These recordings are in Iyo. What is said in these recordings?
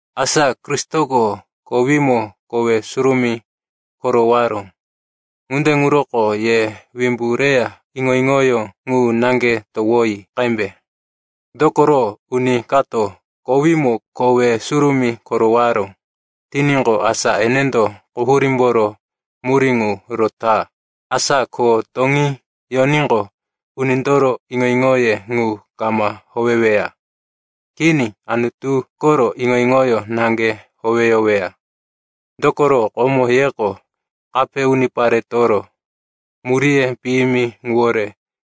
Asa Kristoko kowímo kowe surumí korowaró. Ŋunde ŋuroko ye wimbu reya iŋo-iŋoyó ŋu naŋge towoyi qembe. Dokoro uni kato kowímo kowe surumí korowaró tiníqo, asa enendo quhurímboro murí ŋu rota. Asa ko toŋí yoníqo unindoro iŋo-iŋoye ŋu kama howeweya. Kini, Anutu koro iŋo-iŋoyó naŋge howeyoweya. Dokoro komo yeko kape uniparetoro muríye piyimi ŋuwore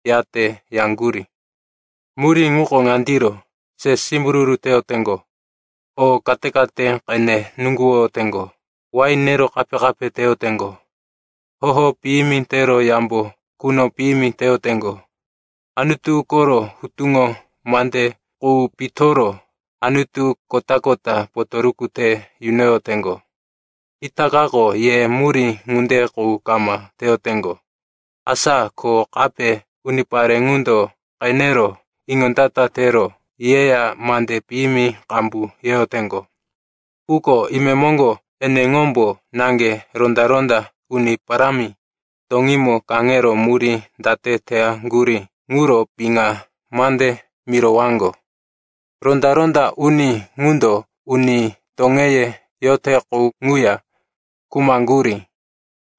yate yaŋgurí. Murí ŋuko ŋandiro: se simbururu teyoteŋgo, o kate-kate qene nuŋguwoyoteŋgo, wain nero kape-kape teyoteŋgo, hoho piyimi tero yambo quno piyimi teyoteŋgo, Anutu koro hutuŋo mande qu pitoro anutu kota-kota potoruku te yunoyoteŋgo. Itakako ye murí ŋunde qu kama teyoteŋgo. Asa ko kape unipare ŋundo qenero iŋondata tero yeya mande piyimi qambu yeyoteŋgo. Quko imemoŋgo eneŋombo naŋge ronda-ronda uni parámi toŋímo kaŋero murí date teyaŋgurí ŋuro piŋa mande mirowaŋgo. Ronda-ronda uni ŋundo uni toŋeye yote qu ŋuya khumaŋgurí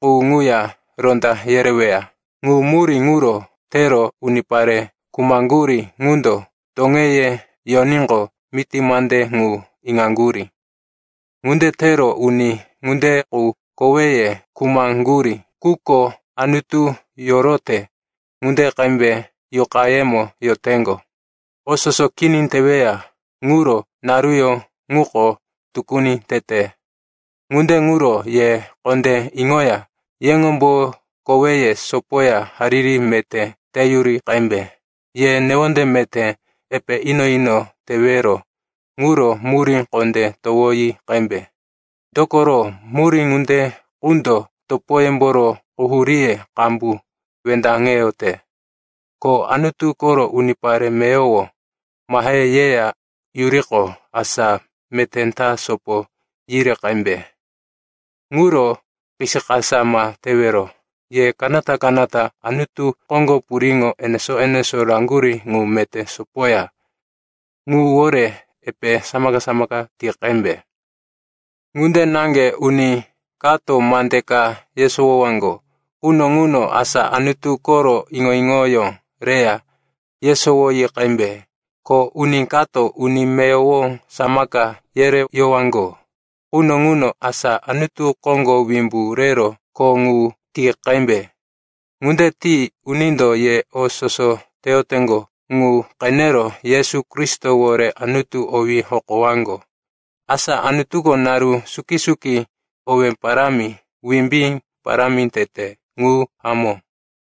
qu ŋuya ronda yereweya. Ŋu murí ŋuro tero unipare khumaŋgurí ŋundo toŋeye yoníqo miti mande ŋu iŋaŋgurí. Ŋunde tero uni ŋunde qu koweye khumaŋgurí, quko Anutu yorote ŋunde qembe yuqayemo yoteŋgo. O soso kini teweya ŋuro naruyó ŋuko tukuni tete. Ŋunde ŋuro ye kondé iŋoya yeŋombo koweye sopoya hariri meté tiyuri qembe. Ye newonde meté epe ino-ino tewero ŋuro murí kondé towoyi qembe. Dokoro, murí ŋunde qundo topoyemboro quhuríye qambu wendaŋeyote. Ko Anutu koro unipare meyowo mahe yeya yuriqo, asa meté ta sopo yiri qembe. Ŋuro kisikasa ma tewero. Ye kanata-kanata Anutu koŋgo puriŋo enesó-enesó raŋgurí ŋu meté sopoya ŋuwore epe samaka-samaka ti qembe. Ŋunde naŋge uni kato mande ka yesowowaŋgo quno ŋuno, asa Anutu koro iŋo-iŋoyó reya yesowoyi qembe. Ko uni kato uni meyowo samaka yereyowaŋgo quno ŋuno, asa Anutu koŋgo wimbu rero kho ŋu ti qembe. Ŋunde ti unindo ye o soso teyoteŋgo ŋu qenero Yesu Kristowore Anutu owí hokowaŋgo. Asa Anutuko naru suki-suki owé parámi, wimbí parámi tete. Ŋu hamó.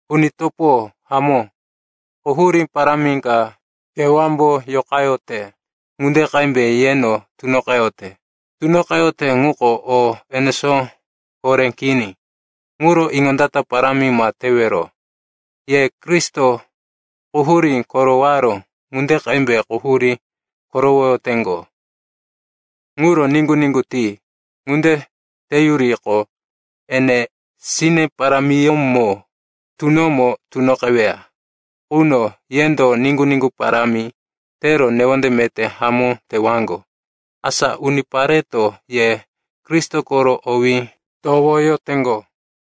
Uni topo hamó, quhurí parámi ka kewámbo yoqayote ŋunde qembe yeno tunoqeyote. Tunoqeyote ŋuko o enesó horé kini, ŋuro iŋondata parámi ma tewero. Ye Kristo quhurí korowaró ŋunde qembe quhurí korowoyoteŋgo ŋuro niŋgu-niŋgu ti. Ŋunde teyuriqo, ene sine parámiyómo tunomo tunoqeweya quno, yendo niŋgu-niŋgu parámi tero newonde meté hamó tewaŋgo. Asa unipareto ye Kristo koro owí towoyoteŋgo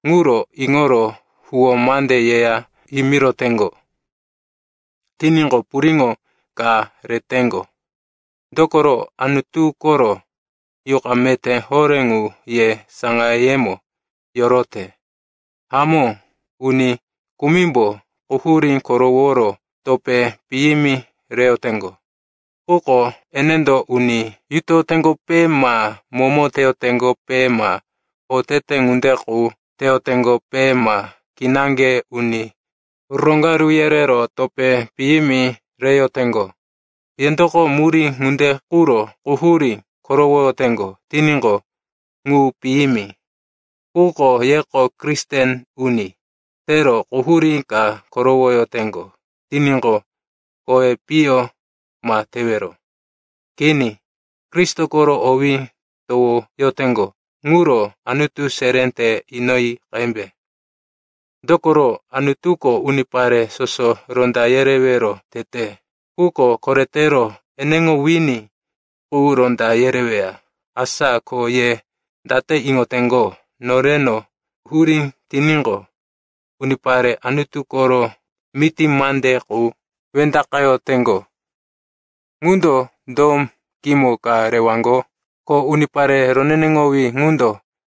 ŋuro iŋoro huwó mande yeya yimiroteŋgo tiníqo, puriŋo ka reteŋgo. Dokoro Anutu koro Yuqa meté horé ŋu ye saŋayemo yorote. Hamó, uni kumimbo quhurí koroworo topé piyimi reyoteŋgo. Quko enendo uni yutoyoteŋgope ma momo teyoteŋgope ma otete ŋunde qu teyoteŋgope ma kinaŋge uni roŋgaru yerero topé piyimi reyoteŋgo. Yendoko murí ŋunde quro quhurí korowoyoteŋgo tiníqo, ŋu piyimi. Quko yeko Kristen uni tero quhurí ka korowoyoteŋgo tiníqo, kowi piyo ma tewero. Kini. Kristo koro owí towoyoteŋgo ŋuro Anutu seré te inoyi qembe. Dokoro Anutuko unipare soso ronda yerewero tete, quko koretero eneŋo wini qu ronda yereweya. Asa ko ye date iŋoteŋgo, noreno hurí tiníqo, unipare Anutu koro miti mande qu wendaqeyoteŋgo ŋundo do kimo ka rewaŋgo? “Ko unipare roneneŋowí ŋundo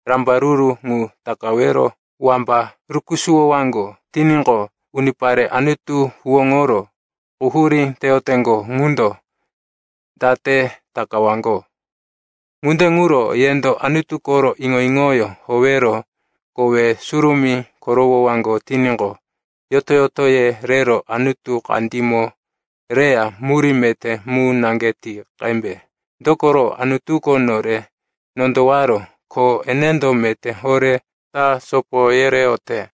rambaruru ŋu takawero wamba rukusuwowaŋgo tiníqo, unipare Anutu huwóŋoro quhurí teyoteŋgo ŋundo date takawaŋgo?” Ŋunde ŋuro yendo Anutu koro iŋo-iŋoyó howero kowe surumí korowowaŋgo tiníqo, yoto-yotoye rero Anutu kandímo reya murí meté mu naŋge ti qembe. Dokoro Anutuko nore nondowaró, ko enendo meté horé ta sopo yereyote.